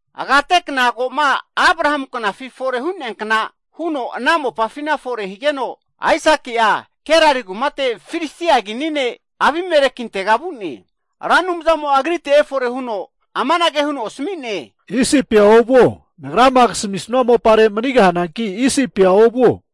Agatekna ko'ma Abrahamu knafi fore hu'neankna huno ana mopafina fore higeno, Aisaki'a Gerari kumate, Abimeleki, Filistia kini ne'tega vu'ne. Ra Anumzamo agrite fore humino amanage huno asmi'ne. Isipia ovuo, Nagrama kasmisua mopare manigahane.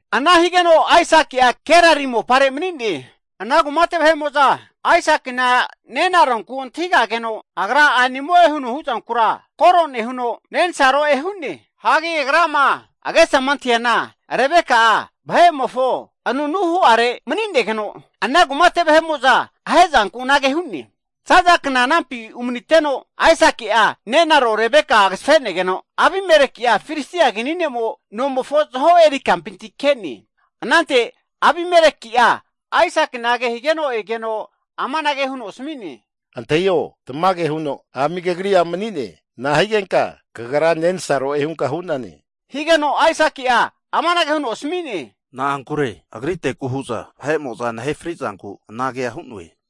Ana higeno Aisaki'a Gerari mani'ne. Ana kumate vahe'mo'za nenaronku antahi kageno, agra amanage hu'ne, A' nimo'e huno huzankura koro huno agra nensaroe hu'ne. Agesama antahiana Rebeka'a vahe'mofo anunu hu'are manigeno, ana kumate vahe'mo'za ahezanku anage hu'ne. Zaza kna anampi umniteno, Aisaki'a nenaro Rebeka agzafene'geno, Abimeleki Filistia kinimo nomofo avo kampinti ke'ne. Anante Abimeleki'a, Aisaki kehuno amanage hu'ne, Antahio, tamage huno ami kagri a' mani'ne! Nahigenka kagra nensaroe hunka hu'nane? Aisaki amanage huno asmi'ne, Na'ankure nagra agriteku hu'na fri'zanku anage hu'noe.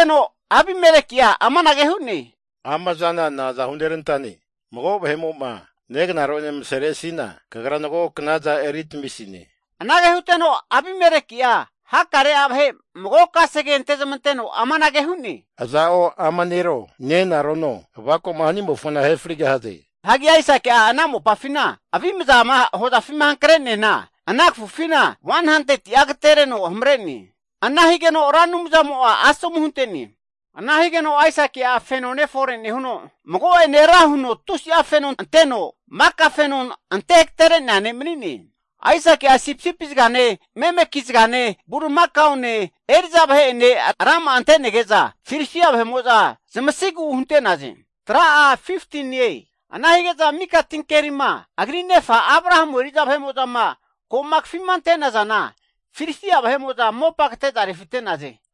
Abimeleki'a amanage hu'ne, Amazana naza hunerantane? Mago vahe'mo negnaro ene msere'sina, kagra mago knaza eri tamisine. Ana huteno Abimeleki'a hakare vahe mago kasege antezmanteno, aza'o ama nero, nenarono avako'ma hanimo'a frigahie hu'ne. Menina Aisaki ana mopafi avimza hozafima hankre'neana ana kfufina 100ti'a agatereno hamre'ne. Ana higeno Ra Anumzamo asomu hunte'ne, ana ne'mo feno ne' fore nehuno, mago'ene ra huno tusi'a feno anteno, mika fenona ante agatere'nea ne' mani'ne. Aisaki'a sipisipi zgane, memeki zgane, Bulimakane, eri'za vahe'ene, rama'a ante'negeza, Filistia vahemo'za zamasigu hunte'naze. Menina mika tinkeri agri nefa eri'za vahe'mo'za Abrahamu knafi kafinte'naza, Filisti'a vahe'mo'za mopa kate'za refite'naze.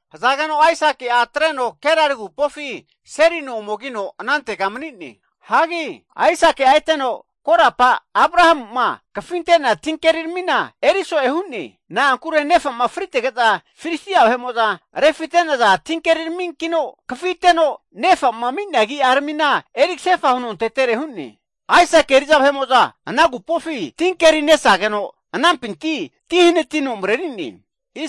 Ananteti Aisaki'a atreno Gerari agupofi seri no anantega omegino mani'ne. Aisaki eteno korapa Abrahamu kafinte'nea tinkeri kafi'ne. Nefa fritege'za Filistia vahe'mo'za refite'naza tinkeri tmina kafiteno, nefa ami'nea agi'a eriksefa huno antetere hu'ne. Aisaki eri'za vahemo'za ana agupofi tinkeri nesageno, anampinti ti fore huno mreri'ne,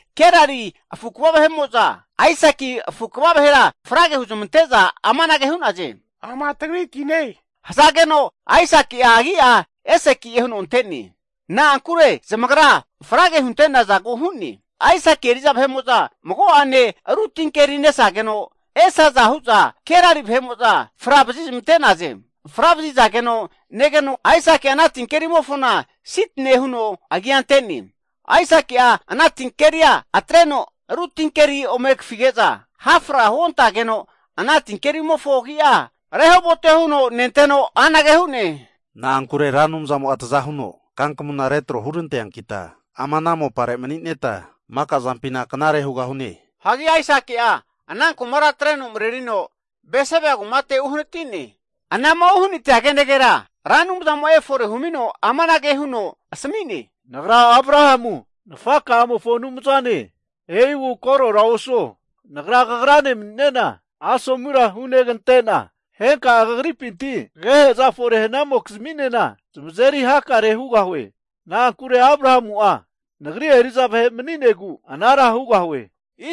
Gerari afu kva vahe'mo'za, Aisaki afu kva vahera frage huzmante'za amanage hu'naze. Ama tagri tine! E'inage hzageno agi'a Eseki'e na'ankure zamagra frage hunante'naze. Aisaki eri'za vahe'mo'za mago'ane ru tinkeri nesageno, esaza hu'za Gerari vahe'mo'za fra vazizmente'naze. Fra vazizageno negeno, Aisaki'a ana tinkerimofona Sitne huno agia ante'ne. Aisaki'a ana tinkeria atreno ru' tinkeri ome kafige'za, hafra huontageno ana tinkerimofo agi'a Rehoboti'e huno ante'ne, na'ankure Ra Anumzamo'a tzahuno kankmuna tro hurante'neankita ama ana mopare eri hakare hurantesigeta manigahune. Aisaki'a ana kumara atreno mrerino Bersiba kumate uhaniti'ne. Ana'ma uhanitia kenegera Ra Anumzamo'a efore humino amanage huno asmi'ne, Nagra Abrahamu nafaka'amofo Anumzane, e'igu korora osuo. Nagra kagrane mani'nena asomura hugante'na henka'a kagripinti kegehe'za fore hnamoki'zminena zamazeri hakare hugahue. Na'ankure Abrahamu'a Nagri eri'za vahe mani'negu ana hugahue.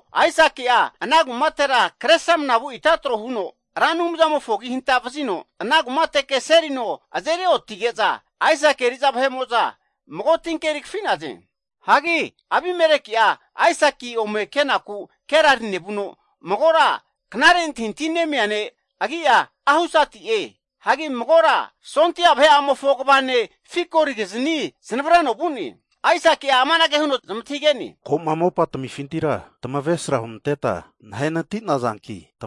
Aisaki'a ana kumatera kre sramna vu ita trohuno, Ra Anumzamofo agi hanta vzino ana kumateke seri no azeri onetige'za, Aisaki eri'za vahemo'za mago tinkeri kafi'naze. Abimeleki'a Aisaki ome kenaku Gerari nevuno, magora knare antahintahi nemia ne' agi'a Ahusati'e, hanki magora ha' vahe'amofo kva ne' Fikoligizni neznavreno vu'ne. Aisaki'a zmantahigeno, Tamagra na'anku nagritega neaze, ko'ma mopa tmifintira tamesra hunanteta nahe nati'nazanki?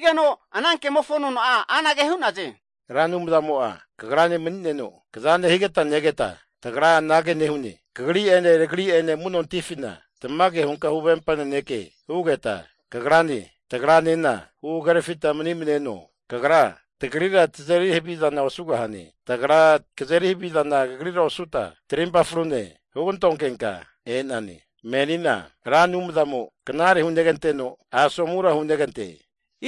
Ana kemofo nona'a anage hu'naze, Ra Anumzamo'a kagrane mani'neno kaza nehigeta negeta, tagra anage nehune, Kagri ene tagri ene amu'notifina tamage hunka huvempa naneke hugeta kagrane, tagra hagerfi mneno. Kagra, tagrira tazeri havizana osugahane, tagra, kagrira kazeri haviza osuta, trimpa frune hugantonkenka e'nane. Menina Ra Anumzamo knare huneganteno asomura hunegante.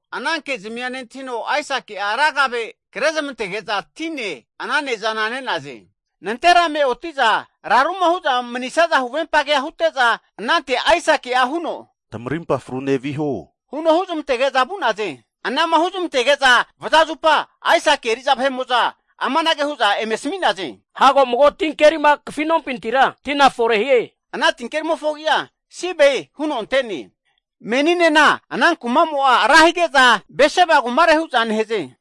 Ana kezmi nentahino Aisaki'a ra kave kre zamentege'za tine ana ne'zana ne'naze. Nantera'me oti'za huvempage hugantugma hute'za, anante Aisaki'a huzmantege'za zamarimpa frune vu'naze. Ana'ma huzamtege'za vaza zupa Aisaki eri'za vahe'mo'za amanage hu'za eme asmi'naze. Hago mago tinkeri kafinompinti tina fore hie. Ana tinkerimofo agi'a Siba huno ante'ne. Meninena ana kumamo'a rahige'za Bersiba kumare hu'za nehaze.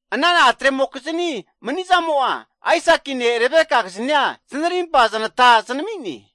Ana atremokizni mani'zamo Aisakine Rebeka gizni znarimpa znata znami'ne.